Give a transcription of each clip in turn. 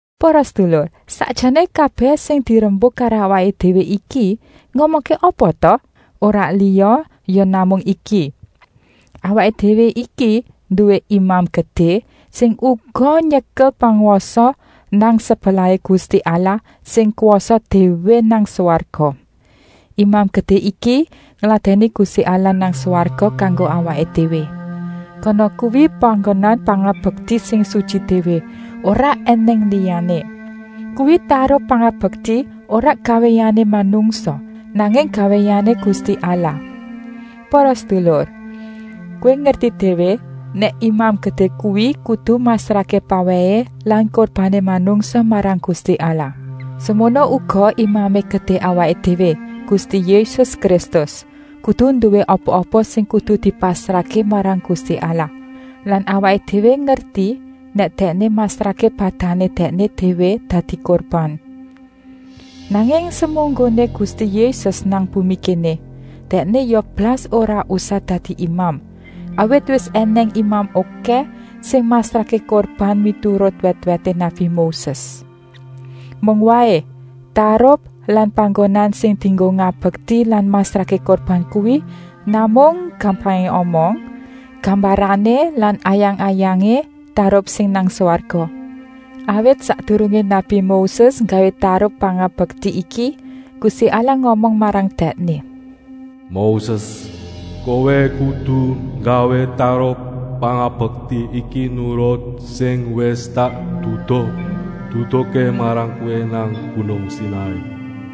Para sedulur, sakjané kabèh sing dirembuk karo awaké déwé iki ngomongké apa ta? Ora liya ya namung iki: awaké déwé iki nduwé Imam Gedé sing uga nyekel pangwasa nang sebelahé Gusti Allah sing kwasa déwé nang swarga. Imam Gedé iki ngladèni Gusti Allah nang swarga kanggo awaké déwé. Kana kuwi panggonan pangabekti sing sutyi déwé, ora ènèng liyané. Kuwi tarup pangabekti ora gawéané manungsa, nanging gawéané Gusti Allah. Para sedulur, kowé ngerti déwé nèk Imam Gedé kuwi kudu masrahké pawèhé lan kurbané manungsa marang Gusti Allah. Semono uga Imamé Gedé awaké déwé, Gusti Yésus Kristus, kudu nduwé apa-apa sing kudu dipasrahké marang Gusti Allah. (Lan awaké déwé ngerti nèk Dèkné masrahké badané Dèkné déwé dadi kurban.) Nanging semunggoné Gusti Yésus nang bumi kéné, Dèkné ya blas ora usah dadi imam, awit wis ènèng imam okèh sing masrahké kurban miturut wèt-wèté nabi Moses. Mung waé, tarup lan panggonan sing dienggo ngabekti lan masrahké kurban kuwi namung, gampangé omong, gambarané lan ayang-ayangé tarup sing nang swarga. Awit sakdurungé nabi Moses nggawé tarup pangabekti iki, Gusti Allah ngomong marang dèkné: “Moses, kowé kudu nggawé tarup pangabekti iki nurut sing wis tak duduh-duduhké marang kowé nang gunung Sinai.”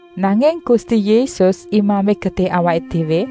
Nanging Gusti Yésus, Imamé Gedé awaké déwé,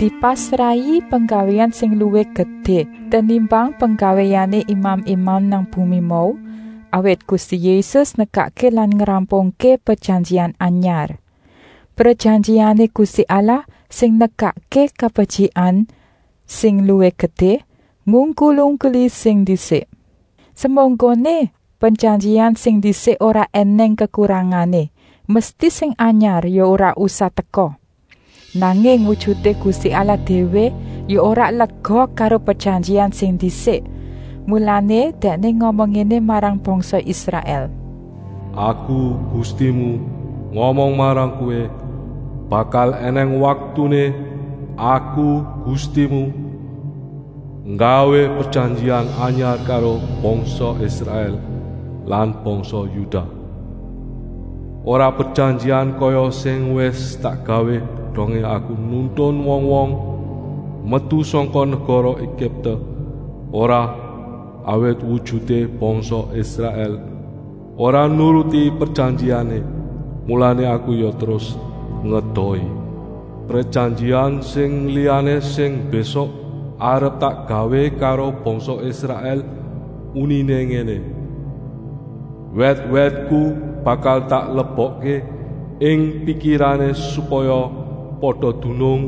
dipasrahi penggawéan sing luwih gedé tenimbang penggawéané imam-imam nang bumi mau, awit Gusti Yésus nekakké lan ngrampungké prejanjian anyar, prejanjiané Gusti Allah sing nekakké kabetyikan sing luwih gedé, ngungkul-ungkuli sing ndisik. Semunggoné prejanjian sing ndisik ora ènèng kekurangané, mesti sing anyar ya ora usah teka. Nanging wujuté Gusti Allah déwé ya ora lega karo prejanjian sing ndisik, mulané Dèkné ngomong ngéné marang bangsa Israèl: “Aku, Gustimu, ngomong marang kowé, bakal ènèng waktuné, Aku, Gustimu, nggawé prejanjian anyar karo bangsa Israèl lan bangsa Yudah. Ora prejanjian kaya sing wis tak gawé dongé Aku nuntun wong-wong metu sangka negara Egipte, ora, awit wujuté bangsa Israèl ora nuruti prejanjiané, mulané Aku ya terus ngedohi. Prejanjian sing liyané sing mbésuk arep tak gawé karo bangsa Israèl uniné ngéné: Wèt-wètku bakal tak lebokké ing pikirané supaya pada dunung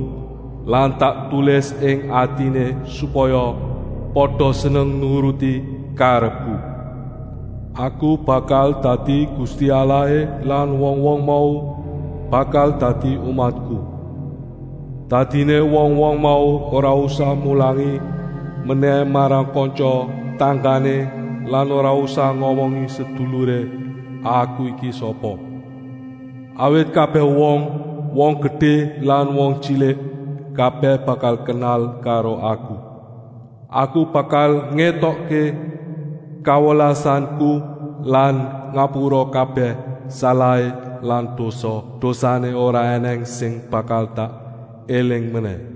lan tak tulis ing atiné supaya pada seneng nuruti karepku. Aku bakal dadi Gusti Allahé lan wong-wong mau bakal dadi umatku. Dadiné wong-wong mau ora usah mulangi menèh marang kantya-tanggané lan ora usah ngomongi seduluré Aku iki sapa. Awit kabèh wong, wong gedé lan wong tyilik, kabèh bakal kenal karo Aku. Aku bakal ngétokké kawelasanku lan ngapura kabèh salahé lan dosa-dosané ora ènèng sing bakal tak éling menèh.”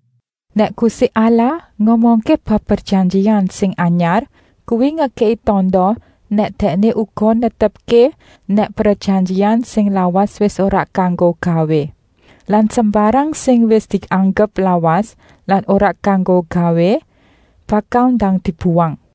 Nèk Gusti Allah ngomongké bab prejanjian sing anyar, kuwi ngekèki tanda nèk Dèkné uga netepké nèk prejanjian sing lawas wis ora kanggo gawé. Lan sembarang sing wis dianggep lawas lan ora kanggo gawé, bakal ndang dibuwang.